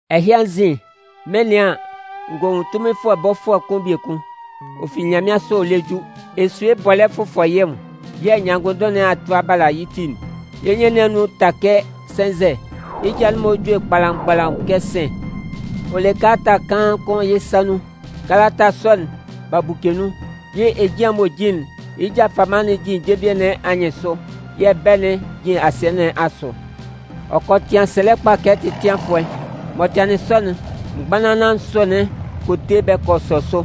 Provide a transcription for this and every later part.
Ɛhɩ anzin, mɩn 'nɩan an, n gɔ nwun tunminfʋɛ bɔfʋɛ kʋn biekun, ɔ fi nyanmɩansʋ ɔ lɛ ju. Esue bɔlɛ́ fʋfɔ yɩ́ nwʋn, yɛ̂ nyanngʋnndʋn nɩn a tʋ a bala yɩ́ ti'n. Yɩ́ nyɩn nɩn anun'n ta kɛ sɛnzɛ. Yɩ́ ja'n-mɔ jue kpalamgbalaʋn kɛ sɩ̂n. Ɔ le kalata kaan kʋn yɩ́ sa nun. Kalata sɔ'n, b'a buke nun. Yɩ́ ejian m'ɔ jin'n, yɩ́ ja fama'n jin jenvie nɩn anyɩnsʋ, yɛ̂ bɛ̂'n jin asɩɛ nɩn asʋ. Ɔ kɔ tɩan sɛlɛ kpa kɛ tɛtɩanfʋɛ. M'ɔ tɩanlɩn sɔ'n, mgbanlanlan nsʋ'n kɔ te bɛ kɔ sɔ sʋ.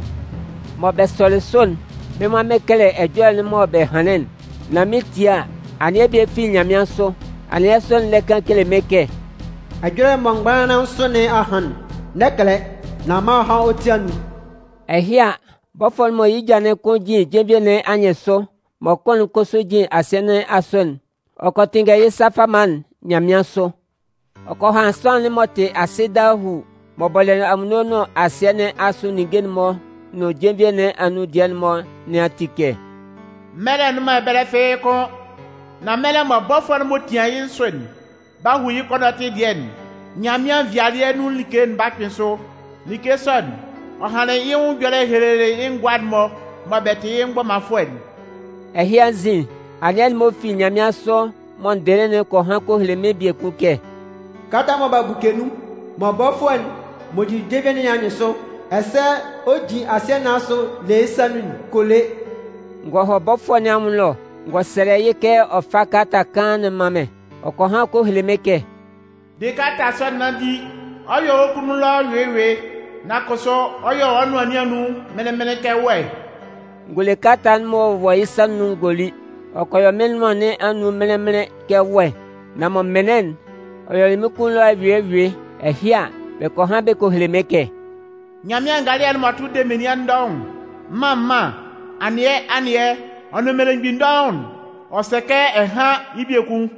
Mɔ bɛ sɔlɩ sʋ'n, mɩ́n nwan mɩn 'kɛlɛ ɛjɔlɛ'n mɔ bɛ hanlɩn'n. Nan mɩn 'tie a, anɩɛ bie fi nyanmɩansʋ. Anɩɛ sɔ'n lɛ kan kele mɩ́n kɛ: “Ɛjɔlɛ'n mɔ mgbanlanlan nsʋ nɩn a han'n, n'ɛ kɛlɛ, nan man ɔ há wɔ́ ti anun.” Ɛhɩ a, bɔfʋɛ'n mɔ yɩ́ ja'n kʋn jin jenvie nɩn anyɩnsʋ, mɔ kʋn'n kʋsʋ jin asɩɛ nɩn asʋ'n, ɔ kɔ tɩnngɛ yɩ́ sa fama'n nyanmɩansʋ. Ɔ kɔ han sʋanlan'n m'ɔ tɩ asɩ dahuu, m'ɔ bɔlɩ anwunno nʋn asɩɛ nɩn asʋ ninnge'n-mɔ nʋn jenvie nɩn anun dɩɛ'n-mɔ nɩn ati kɛ: “Mɛlɛ nnʋn man ɛbɛlɛ fɩ́ɩ́ kʋ́n! Nan mɛlɛ mɔ bɔfʋɛ'n m'ɔ tian yɩ́ nsʋ'n 'ba hu yɩ́ kɔnɔtɩ dɩɛ'n, Nyanmɩan nvɩalɩɛ nun like'n 'ba kpɩn sʋ. Like sɔ'n, ɔ hanlɩn yɩ́ nwʋn ɛjɔlɛ ɔ helelɩ yɩ́ ngʋa'n-mɔ mɔ bɛ tɩ yɩ́ mgbɔmanfʋɛ'n.” Ɛhɩ anzin, anɩɛ'n m'ɔ fi nyanmɩansʋ m'ɔ n dɩlɩ'n kɔ han kɔ hele mɩ́n biekun kɛ: “Kalata'n mɔ b'a buke nun mɔ bɔfʋɛ'n m'ɔ jin jenvie nɩn anyɩnsʋ, ɛsɛ ɔ jin asɩɛ nɩn asʋ le yɩ́ yɩ́ sa nun'n, kɔ le.” N gɔ hɔ bɔfʋɛ nɩn anwʋn ɛlɔ, n gɔ sɛlɛ yɩ́ kɛ ɔ fá kalata kaan'n mán mɩ́n. Ɔ kɔ han kɔ hele mɩ́n kɛ: “De kalata sɔ'n nán di. Ɔ 'yɔ wɔ́ kunnun ɛlɔ ɛyʋɩ ɛyʋɩ, nan kʋsʋ ɔ 'yɔ wɔ́ nʋan nɩn anun mɩnlɩn-mɩnlɩn kɛ wɛ.” N gɔ le kalata'n m'ɔ wɔ yɩ́ sa nun'n n gɔ li. Ɔ kɔ yɔ mɩ́n nʋan nɩn anun mɩnlɩn-mɩnlɩn kɛ wɛ, nan mɔ m mɩnlɩn'n, ɔ yɔlɩ mɩ́n kunnun ɛlɔ ɛyʋɩ ɛyʋɩ. Ɛhɩ a, bɛ kɔ han bɛ kɔ hele mɩ́n kɛ: “Nyanmɩan ngalɩɛ'n m'ɔ tʋ de menian dɔʋn'n, mân mân, anɩɛ anɩɛ ɔ nʋn mmelemgbin dɔʋn'n, ɔ sɛ kɛ ɛ hán yɩ́ biekun.”